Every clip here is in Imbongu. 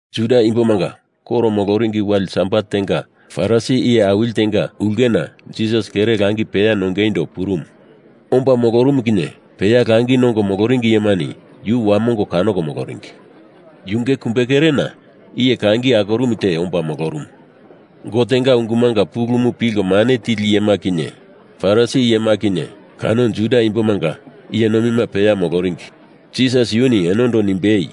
Juda imbomanga koro mololi wale sabat tenga Farisi iye awili tenga ulkena Jisas kere langi peya nongeindo purumu. Omba molorumu kinye peya langi nongo moloringi iyemani yu wamongo kanoko moloringi. Yunge kumbekerena iye kangi akorumu te omba molorumu. Gotenga ungumanga pulumu pilko mane tili iyema kinye, Farisi iyema kinye, kano Juda imbomanga iye nomima peya moloringi Jisas yuni enondo nimbei,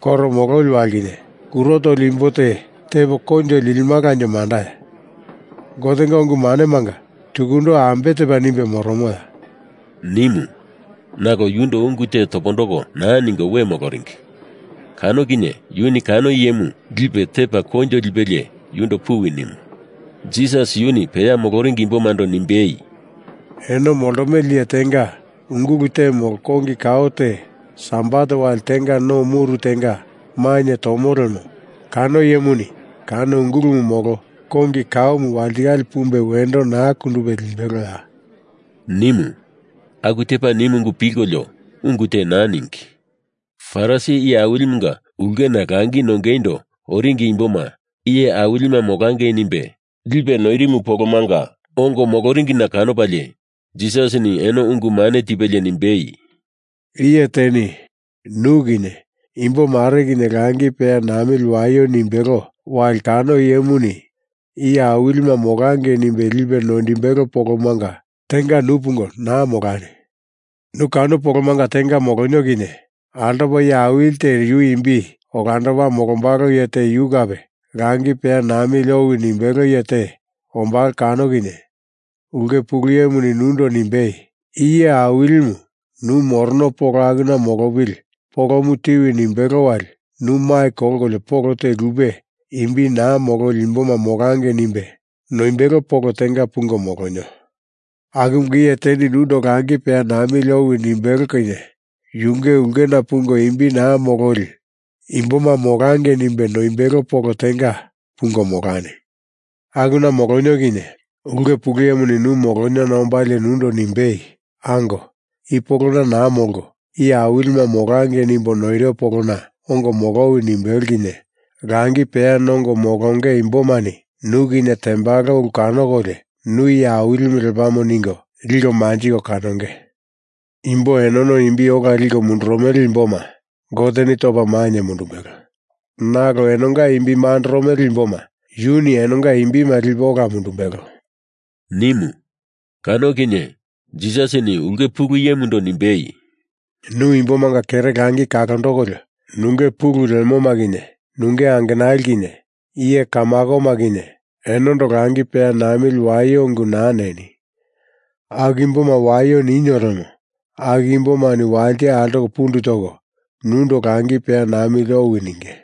“Koro mololi wali kinye kuro toli imbo te tepo koinjo lilimalanje mandaya? Gotenga ungu manemanga tukundo ambe tepa nimbe moromoya?” nimu. Nalo yundo ungu te topondoko naa ningo we moloringi. Kano kinye yuni kano iyemu lipe tepa koinjo lipelie yundo puwi nimu. Jisas yuni peya moloringi imbomando nimbei, “Eno moltomele iye tenga ungulu te molo kongi kao te Sabat wali tenga no muru tenga mainye tomo lemo kano iyemuni kano ungulumu molo kongi kaomu walitikale pumbo wendo naa kundupe limbeloya?” nimu. Aku tepa nimu ungu pilkolio ungu te naa ningi. Farisi iye awilimunga ulkena langi nongeindo oringi imboma iye awilima molangei nimbe lipe noirimu polomanga ongo moloringina kanopalie Jisasini eno ungu mane tipelie nimbei, “Iye teni nu kinye imbo mare kinye langi peya namili waio nimbelo wali kano iyemuni iye awilima molangei nimbe lipe noimbelo polomanga tenga nu pungo naa molani. Nu kano polomanga tenga molonio kinye altopa iye awili te yu imbi olandopa molombalo iye te yu kape langi peya namili owi nimbelo iye te ombalo kano kinye ulke pulu iyemuni nundo nimbei, ‘I iye awilimu nu morono polo akuna molopili polomo tiwi,’ nimbelo wali nu mai kolkolio polo te lupe, imbi naa mololi imboma molangei nimbe noimbelo polo tenga pungo molonio. Akumunga iye teni nundo langi peya namili owi nimbelo kinye yunge ulkena pungo imbi naa mololi imboma molangei nimbe noimbelo polo tenga pungo molani! Akuna molonio kinye ulke pulu iyemuni nu moloniona ombalie nundo nimbei, ‘Ango, i polona naa molko iye awilima molangei nimbo noiro polona ongo molowi,’ nimbelo kinye langi peya nongo molonge imbomani nu kinye tembalo ulu kanokolio nu iye awilimu lepamo ningo liko manjiko kanonge. Imbo enono imbi ola liko mundurumele imboma Goteni topa mainye mundumbelo, nalo enonga imbi mandoromele imboma yuni enonga imbima lipe ola mundumbelo,” nimu. Kano kinye Jisasini ulke pulu iyemundo nimbei, “Nu imbomanga kere langi kalondokolio nunge pulu lemoma kinye, nunge angenali kinye, iye kamakoma kinye enondo langi peya namili waio ungu naa neni! Aku imboma waio ninio lemo, aku imbomani walite altoko pundu toko, nundo langi peya namili owi ninge.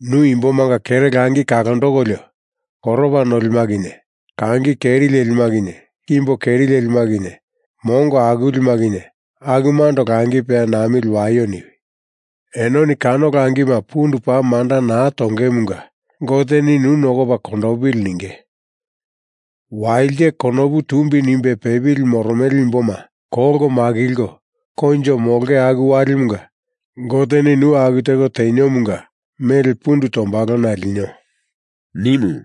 Nu imbomanga kere langi kalondokolio koropa nolima kinye, kangi keri lelima kinye, kimbo keri lelima kinye, mongo akulima kinye akumando langi peya namili waio niwi! Enoni kano langima pundu paa manda naa tongemunga Goteni nu nokopa kondopili ninge. Walite konopu tumbi nimbe pepili moromele imboma kolko makilko koinjo molonge aku walimunga Goteni nu aku teko teniomunga mele pundu tombalona linio,” nimu.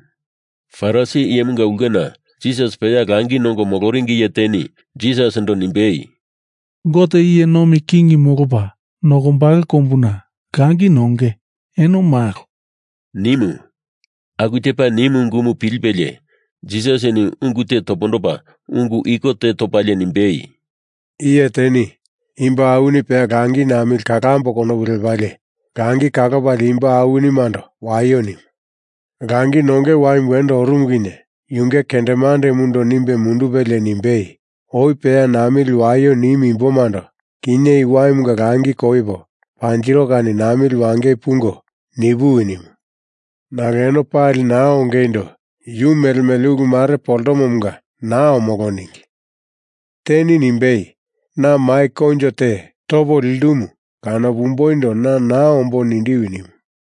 Farisi iyemunga ulkena Jisas peya langi nongo moloringi iye teni Jisasindo nimbei, “Gote iye nomi kingimu molopa nokombalo kombuna langi nonge eno malo,” nimu. Aku tepa nimu ungumu pilipelie Jisasini ungu te topondopa ungu iko te topalie nimbei, “Iye teni imbo awini peya langi namili kalambo konopu lepalie langi kalopalie imbo awinimando waio nimu. Langi nonge waimu wendo orumu kinye yunge kendemandemundo nimbe mundupelie nimbei, ‘Oi peya namili waio nimu imbomando kinye i waimunga langi koipo panjiro kani namili wangei pungo nipuwi!’ nimu. Nalo eno pali naa ongeindo yu mele mele ulu mare poltomomunga naa omolo ningi. Teni nimbei, ‘Na mai koinjo te topo lindumu kanopumboindo na naa ombo nindiwi!’ nimu.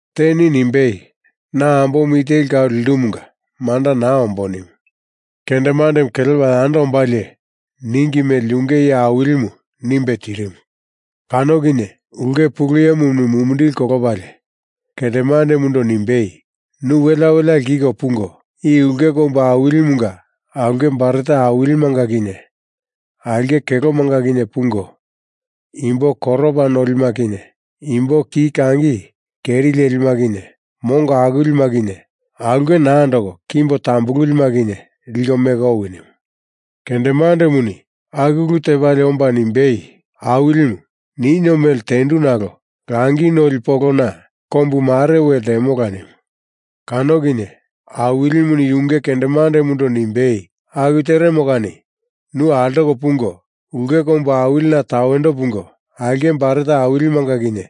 Teni nimbei, ‘Na ambomu i teli kau lindumunga manda naa ombo,’ nimu. Kendemandemu kelepa yando ombalie ningi mele yunge iye awilimu nimbe tirimu. Kano kinye ulke pulu iyemuni mumindili kolopalie kendemandemundo nimbei, ‘Nu welea welea lkiko pungo, i ulke kombu awilimunga aulke baret awilimanga kinye aulke kelomanga kinye pungo, imbo koropa nolima kinye kimbo ki kangi keri lelima kinye mongo akulima kinye aulke naa andoko kimbo tambululima kinye liko meko owi!’ nimu. Kendemandemuni aku ulu tepalie omba nimbei, ‘Awilimu, ninio mele tendu nalo langi noli polona kombu mare we ltemola,’ nimu. Kano kinye Awilimuni yunge kendemandemundo nimbei, ‘Aku teremo kani nu altoko pungo, ulke kombu awilina tawendo pungo aulke baret awilimanga kinye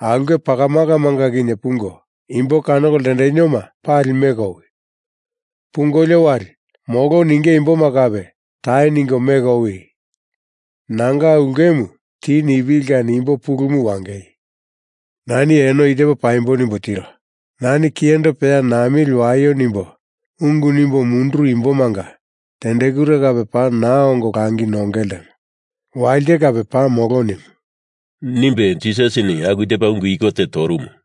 aulke pakamakamanga kinye pungo, imbo kanoko ltendenioma pali meko owi! Pungolio wali, molo ninge imboma kape tai ningo meko owi nanga ulkemu ti nipili kani imbo pulumu wangei! Na eno i tepo paimbo nimbo tiro. Nani kiyendo peya namili waio nimbo, ungu nimbo munduru imbomanga tendekure kape paa naa ongo langi nonge ltemo. Walite kape paa molo,’ nimu,” nimbe Jisasini aku tepa ungu iko te torumu.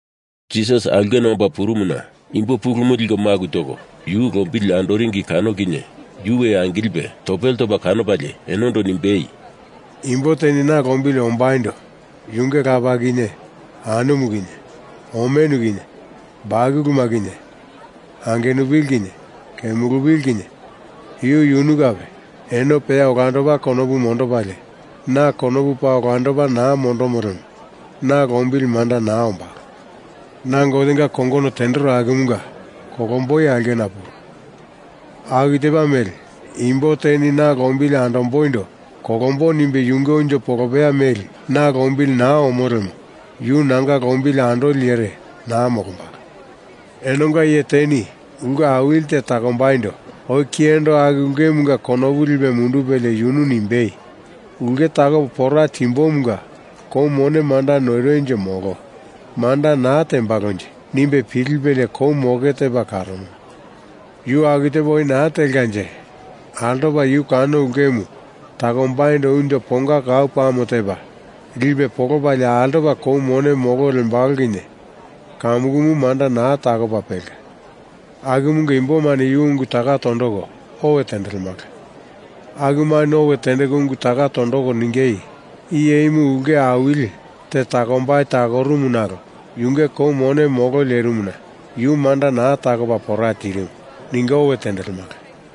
Jisas aulkena omba purumuna imbo pulumu liko maku toko yu lombili andoringi kano kinye yu we angilipe topele topa kanopalie enondo nimbei, “Imbo teni na lombili ombaindo yunge lapa kinye, anumu kinye, omenu kinye, bakuluma kinye, angenupili kinye, kemulupili kinye, yu yunu kape, eno peya olandopa konopu mondopalie, na konopu paa olandopa naa mondomo lemo na lombili manda naa ombalo. Na Gotenga kongono tendero akumunga kolomboi aulkena puro. Aku tepa mele imbo teni na lombili ombaindo kolombo nimbe yunge unjo polopeya meli na lombili naa omo lemo yu nanga lombili andoli iyere naa molombalo. Enonga iye teni ulke awili te takombaindo oi kiyendo aku ulkemunga konopu lipe mundupelie yunu nimbei, ‘Ulke takopo pora timbomunga kou mone manda noironje molo manda naa tembalonje?’ nimbe pilipelie kou moke tepa karomo. Yu aku tepa oi naa telkanje altopa yu kano ulkemu takombaindo unjo ponga kau pame tepa lipe polopalie altopa kou mone molo lembalo kinye kamukumu manda naa takopa pelka. Akumunga imbomani yu ungu taka tondoko owe tendelemala. Akumani owe tendeko ungu taka tondoko ningei, ‘I iyemu ulke awili te takombai takorumu nalo yunge kou mone molo lerimuna yu manda naa takopa pora tirimu,’ ningo owe tendelemala.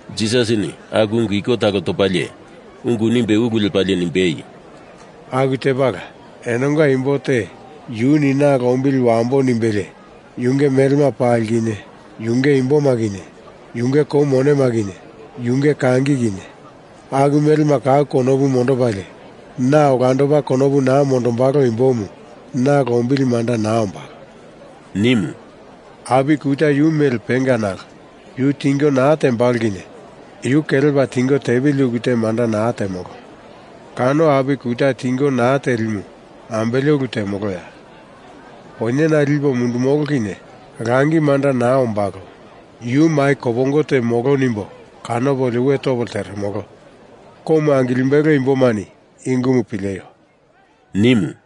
Jisasini aku ungu iko talo topalie ungu nimbe ulu lepalie nimbei, “Aku tepala enonga imbo te yuni na lombili wambo nimbelie yunge melema pali kinye, yunge imboma kinye, yunge kou mone kinye, yunge kangi kinye, aku melema kau konopu mondopalie, na olandopa konopu naa mondombalo imbomu na lombili manda naa ombalo,” nimu. “Api kuta yu mele penga nalo yu tingo naa tembalo kinye yu kelepa tingo tepili ulu te manda naa temolo. Kano api kuta tingo naa telimu ambele ulu temoloya? Poinyena lipo mundumolo kinye langi manda naa ombalo. Yu mai kopongo te molo nimbo kanopolio we topo lteremolo. Komu angilimbelo imbomani i ungumu pileio,” nimu.